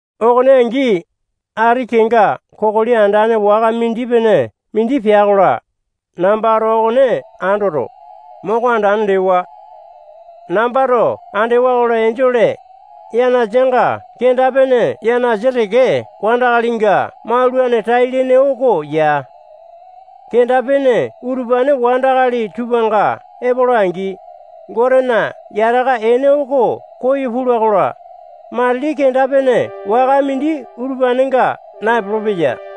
Okone angi, ati kenga kokoli andane waka mindi-pene mindi pea-kola, nambato okone andoto, moko andane lewa. Nambato andewa-kola, enjole yanasanga kenda-pene yanasa teke wandakalinga maulane tai-lene oko ya. Kenda-pene utupane wandakali tupanga epola-angi, Gotena yataka ene oko koyo pula-kola, matili kenda-pene waka mindi utupanenga naepolo-peya.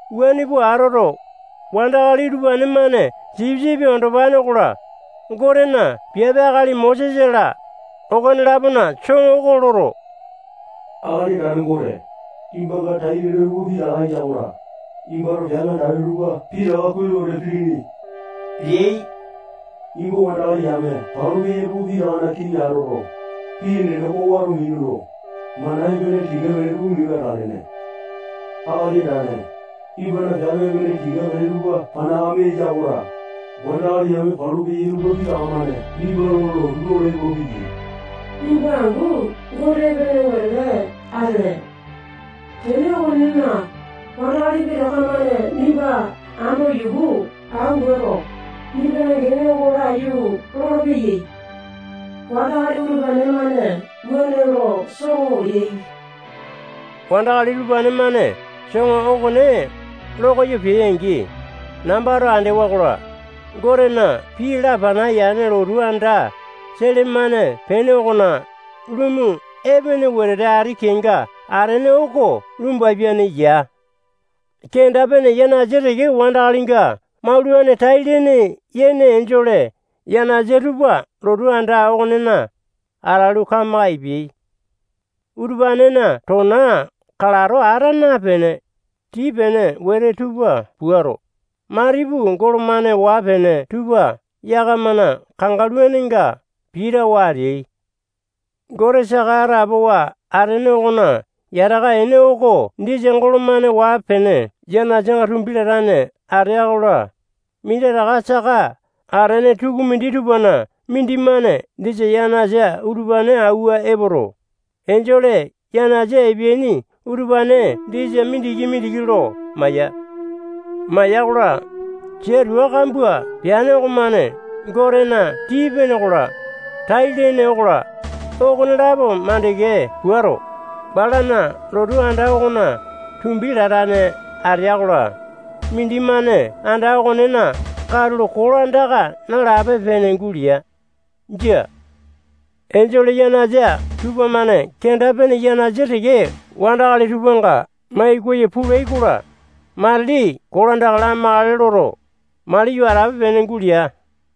Wuane pua atoto, wandakali utupane-mane Sipisipi Andopane okola, Gotena piape akali Mosesa-la, okone-lapona soŋo oko loto, Akali Andane Gote, nimbanga tai-lene tupa pitaka eya-kola, nimbato piape andane tupa pitaka kuai lo wete pilini leai. Nimba wandakali yame palu peya tupa pitakana kiŋi atoto, pii enene oko wato minuto, mana epene tika-pene tupa minu atalene. Akali Andane, nimbana piape epene tika-pene tupa panakame eya-kola, wandakali yame palu peyai tupa pitaka-mane nimba lo lotu lolo epolopeyai. Nimba angu Gote epene wetete atele. Tene okonena, wandakali pitaka-mane nimba ando yuku anguato, nimbana gene oko laiyu lolopeyai. Wandakali utupane-mane wuane lo soŋo leai. Wandakali utupane-mane soŋo okone lokoyo peai-angi, nambato andewa-kola, Gotena pii lapana yane lotu anda sele-mane pene okona lumu epene wetete ati kenga atene oko lumbapiane ya. Kenda-pene yanasa teke wandakalinga maulane tai-lene yene enjole yanasa tupa lotu anda okonena atalu, kamaka epeai. Utupanena tona kalato ata napene, tii-pene wete tupa puato, matipu golo-mane waa-pene tupa yakamana kangaluninga pitawa ateai. Gote saka atapowa atene okona yataka ene oko disa golo-mane waa-pene yanasanga tumbi latane atea-kola, minditaka saka atene tukumindi tupana mindimane disa yanasa utupane auwa epoto, enjole yanasa epeaini utupane disa mindiki-mindiki lo maya. Maya-kola, sia tua kambua peane okomane Gotena tii-pene okola, tai-lene okola, okonelapo makande puato, balana lotu anda okona tumbi latane atea-kola, mindimane anda okonena katulo kolandaka nalape-pene gulea. Jia. Enjole yanasa tupamane kenda-pene yanasa teke wandakali tupanga mai koyo pulai-kola, matili kolandaka lamakale loto, mali yo atape-pene gulea.